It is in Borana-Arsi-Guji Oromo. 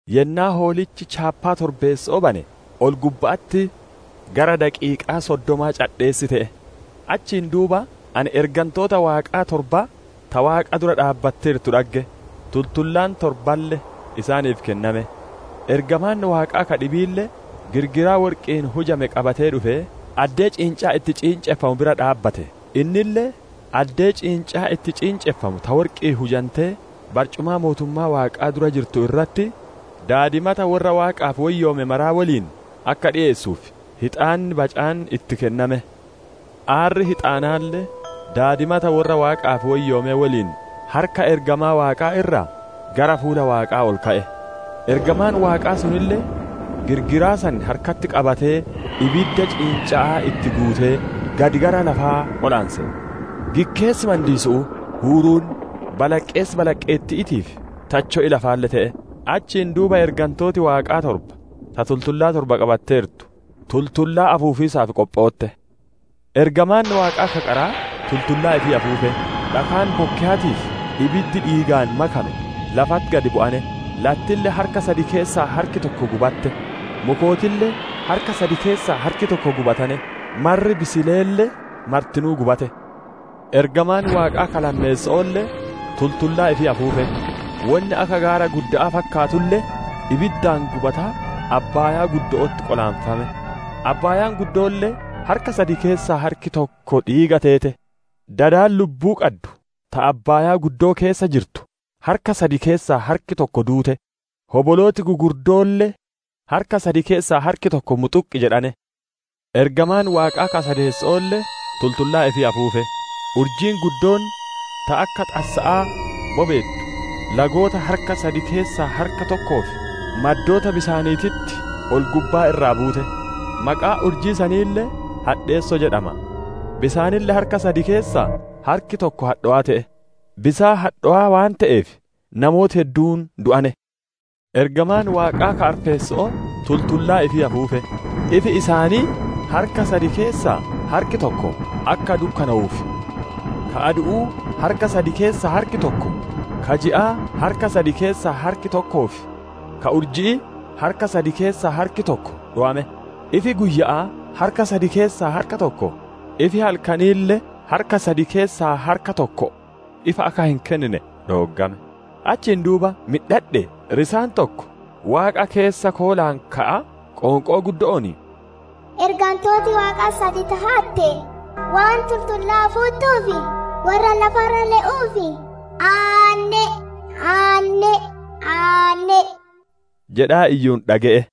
Yennaa Hoolichi chaappaa torbeesso'oo bane, ol-gubba'atti gara daqiiqaa soddomaa cadheessi te'e. Achiin duuba ani ergantoota Waaqaa torba ta Waaqa dura dhaabbattu dhagge; tultullaan torballe isaaniif kenname. Ergamaan Waaqaa ka dhibiille girgiraa worqi'iin hujame qabatee dhufee, addee ciincaan itti ciinceffamu bira dhaabbate; innille addee ciincaan itti ciinceffamu ta worqi'iin hujantee barcumaa mootummaa Waaqaa dura jirtu irratti, daadimata worra Waaqaaf woyyoome maraa woliin akka dhiyeessuuf, hixaanni bacaan itti kenname. Aarri hixaanaalle daadimata worra Waaqaaf woyyoomee woliin harka ergamaa Waaqaa irraa gara fuula Waaqaa ol ka'e. Ergamaan Waaqaa sunille girgiraa san harkatti qabatee ibidda ciinca'aa itti guutee gad gara lafaa qolaanse; gikkeessi mandiisu'uu, huuruun, balaqqeessi balaqqeetti'iitii fi tacho'i lafaalle te'e. Achiin duuba ergantooti Waaqaa torba ta tultullaa torba qabatteertu tultullaa afuufiisaaf qophootte. Ergamaan Waaqaa ka qaraa tultullaa ifii afuufe. Dhakaan bokkeyaatii fi ibiddi dhiigaan makame lafatti gad bu'ane; lattille harka sad keessaa harki tokko gubatte; mukootille harka sad keessaa harki tokko gubatane; marri bisileelle martinuu gubate. Ergamaan Waaqaa ka lammeesso'oolle tultullaa ifii afuufe. Wonni akka gaara gudda'aa fakkaatulle ibiddaan gubataa abbaaya'atti qolaanfame; abbaayaan guddoolle harka sad keessaa harki tokko dhiiga teete. Dadi lubbuu qaddu ta abbaayaa keessa jirtu, harka sad keessaa harki tokko duute; hobolooti gugurddootille harka sad keessaa harki tokko muxuqqi jedhane. Ergamaan Waaqaa ka sadeesso'oolle tultullaa ifii afuufe. Urjiin guddoon ta akka xassa'aa bobeettu lagoota harka sad keessaa harka tokkoo fi maddoota bisaaniititti ol-gubbaa irraa buute. Maqaan urjii saniille, «Hadheesso» jedhama. Bisaanille harka sad keessaa harki tokko hadhowaa te'e; bisaan hadhowaa waan te'eef namooti hedduun du'ane. Ergamaan Waaqaa ka arfeesso'oo tultullaa ifii afuufe. Ifi isaanii harka sad keessaa harki tokko akka dukkanowuuf, ka adu'uu harka sad keessaa harki tokko, ka ji'aa harka sad keessaa harki tokkoo fi ka urji'ii harka sad keessaa harki tokko dhowame; ifi guyya'aa harka sad keessaa harka tokko, ifi halkaniille harka sad keessaa harka tokko ifa akka hin kennine dhooggame. Achiin duuba midhadhee, risaan tokko waaqa keessa koolaan ka'aa qoonqoo guddo'oon, «Ergantooti Waaqaa sad ta hatte, waan tultullaa afuuttuuf, worra lafa irra le'uuf aanne'e! Aanne'e! Aanne'e!» jedhaa iyyuun dhage'e.